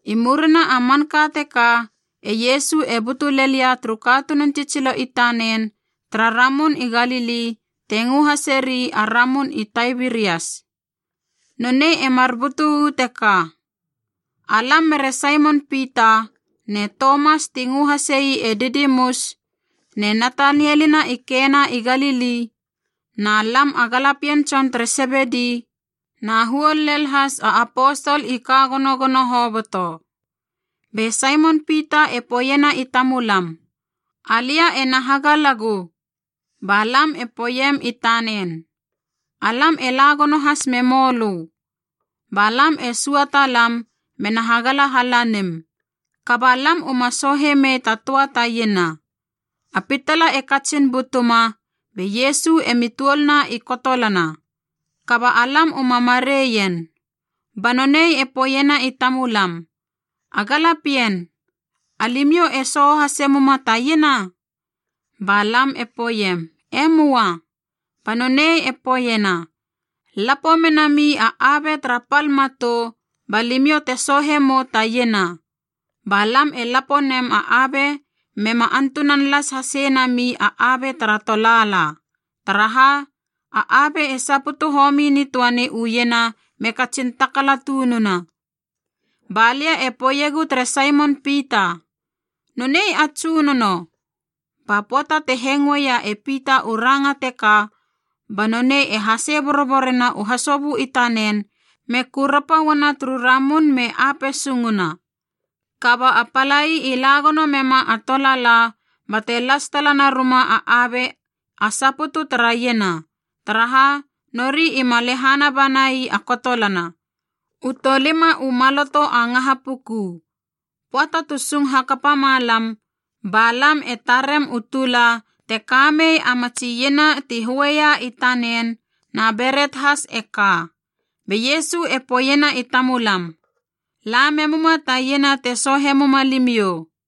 I murina a manka teka e Iesu e butu lelia turu katunun tsitsilo i tanen tara Ramun i Galili te ngö haseri a Ramun i Taibirias. Nonei e mar butu u teka. Alam mere Saimon Pita, ne Tomas ti ngö hasei “e Didimus,” ne Natanielina i Kena i Galili, na lam a galapien tson tere Sebedi, na huol lel has a aposol i ka gonogono hoboto. Be Saimon Pita e poeiena i tamulam, “Alia ena hagalagu.” Ba lam e poeiem i tanen, “Alam e la gono has memou lö.” Ba lam e sua talam mena hagala halanim, kaba lam uma soohe mei ta töa ta iena. A pitala e katsin butuma, be Iesu emi tuolna i kotolana. Kaba alam uma mareien. Ba nonei e poeiena i tamulam, “A galapien, alimiou e sooho hase muma ta iena?” Ba lam e poeiem, “E möa.” Ba nonei e poeiena, “Lapo menami a abe tara pal matou, ba limiou te soohe mou ta iena.” Ba lam e lapo nem a abe mema antunan las hasei nami a abe tara tolaala, taraha a abe e saputu homi nitöani u iena me katsin takala tununa. Ba lia e poeiegu tere Saimon Pita, “Nonei a Tsunono!” Ba pöata te hengoeia e Pita u ranga teka, ba nonei e hasei boroborena u hasobö i tanen me kurapa uana turu ramun me ape sunguna. Kaba a palai i la gono mema a tolaala bate las tala naruma a abe a saputu tara iena, taraha nori ima lehana bana ii a kotolana, u tolima u maloto a ngaha puku. Pöata tu sung hakapa ma lam, ba lam e tarem u tula te kamei a matsi iena ti höia i tanen, na beret has e ka. Be Iesu e poeiena i tamulam, “La memuma ta iena te soohe muma limiou.”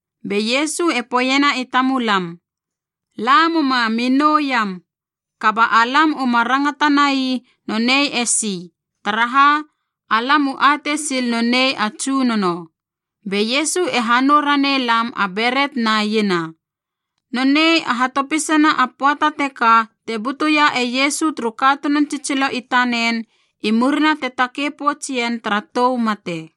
Be Iesu e poeiena i tamulam, “La muma mi nouiam.” Kaba alam uma rangatanai nonei esi, taraha alam u atei sil nonei a Tsunono. Be Iesu e hanou ranei lam a beret na iena. Nonei a hatopisana a pöata teka te butuia e Iesu turu katunun tsitsilo i tanen i murina te takei pouts ien tara tou mate.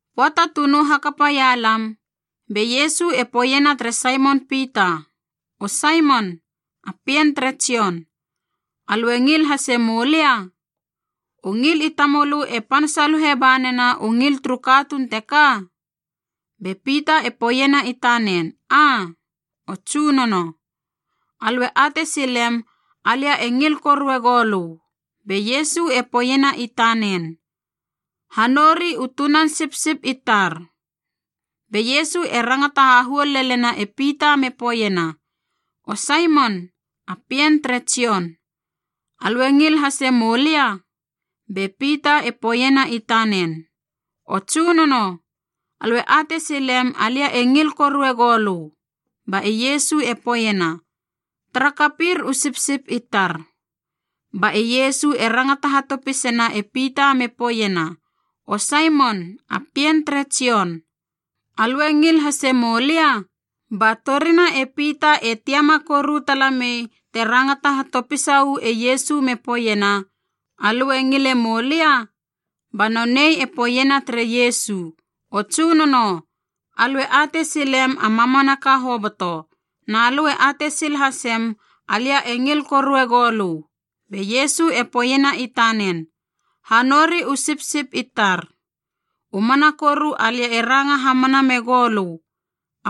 Pöata tu nou hakapaia lam, be Iesu e poeiena tere Saimon Pita, “O Saimon, a pien tere Jon, alö e ngil hase moulia? U ngil i tamölö e pan saluhe ba nena u ngil turu katuun teka?” Be Pita e poeiena i tanen, “Aa, o Tsunono. Alö e atei silem alia e ngil korue goulö.” Be Iesu e poeiena i tanen, “Ha nou ri u tunan sipsip i tar.” Be Iesu e rangata hahuol lelena e Pita me poeiena, “O Saimon, a pien tere Jon, alö e ngil hase moulia?” Be Pita e poeiena i tanen, “O Tsunono, Alö e atei silem alia e ngil korue goulö.” Ba e Iesu e poeiena, “Tara kapir u sipsip i tar.” Ba e Iesu e rangata hatopiseiena e Pita me poeiena, “O Saimon, a pien tere Jon, alö e ngil hase moulia?” Ba torina e Pita e tiama koru tala mei te rangata hatopisa uu e Iesu me poeiena, “Alö e ngile moulia?” Ba nonei e poeiena tere Iesu, “O Tsunono, alö e atei silem a mamanaka hoboto, na lö e atei sil hasem alia e ngil korue goulö.” Be Iesu e poeiena i tanen, “Hanouri u sipsip i tar. U mana koru alia e ranga hamana megou lö,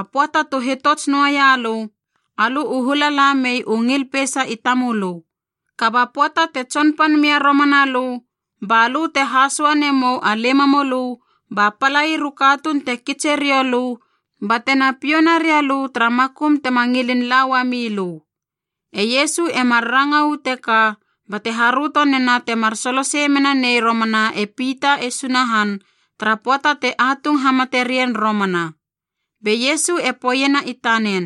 a pöata tu hitots noaia lö, alö u hula la mei u ngil peisa i tamölö. Kaba pöata te tsonpan mia romana lö, balö te hasoa nemou a limamölö ba palair u katuun te kitse riou lö bate na piou naria lö tara makum tema ngilin la uamilö.a” E Iesu e mar ranga uu teka bate haröto nena temar solosei mena nei romana e Pita e Sunahan tara pöata te atung hamate rien romana. Be Iesu e poeiena i tanen,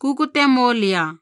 “Kukute mou lia.”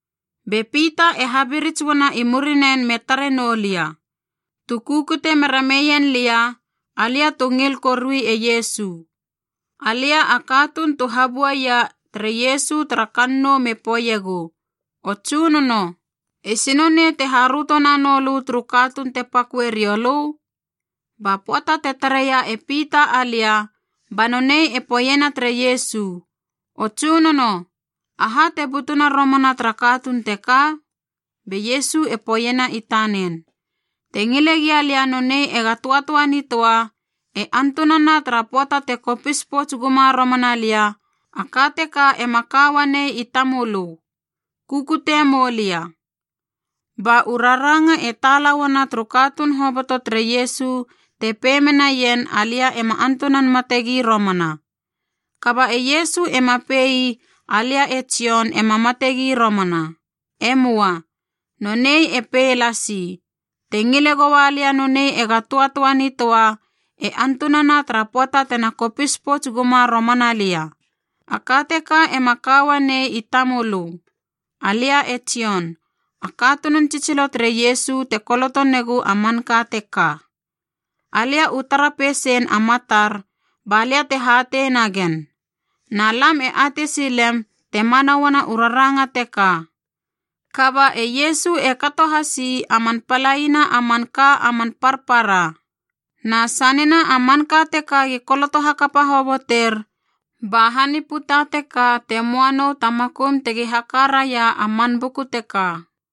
Be Pita e habirits uana i muriren me tare noulia, tu kukute mera meien lia, alia tu ngil korui e Iesu. (Alia a katuun tu habuaia tere Iesu tara kannou me poeiegu, “O Tsunono, esi nonei te haröto nanou lö turu katuun te paköe riou lö?”) Ba pöata te tareia e Pita alia, ba nonei e poeiena tere Iesu, “O Tsunono, aha te butuna romana tara katuun teka?” Be Iesu e poeiena i tanen, “Te ngile gia lia nonei ega töatöa nitöa e antunana tara pöata te kopis pouts guma romana lia, a ka teka ema ka uanei i tamölö. Kukute mou lia!” Ba u raranga e tala uana turu katuun hoboto tere Iesu te pei menaien alia ema antunan mate gi romana. Kaba e Iesu ema pe ii alia e Jon ema mate gi romana. E möa. Nonei e pei lasi, “Te ngile goua lia nonei ega töatöa nitöa e antunana tara pöata tena kopis pouts guma romana lia, a ka teka ema ka uanei i tamölö.” Alia e Jon, a katunun tsitsilo tere Iesu te koloto negu a manka teka. Alia u tara peisein a matar balia te hatei nagen, na lam e atei silem te mana uana u raranga teka. Kaba e Iesu e kato hasi a man palaina a manka a man parpara. Na sanena a manka teka gi koloto hakapa hoboter, ba han i puta teka te moa nou ta makum tegi haka raia a man buku teka.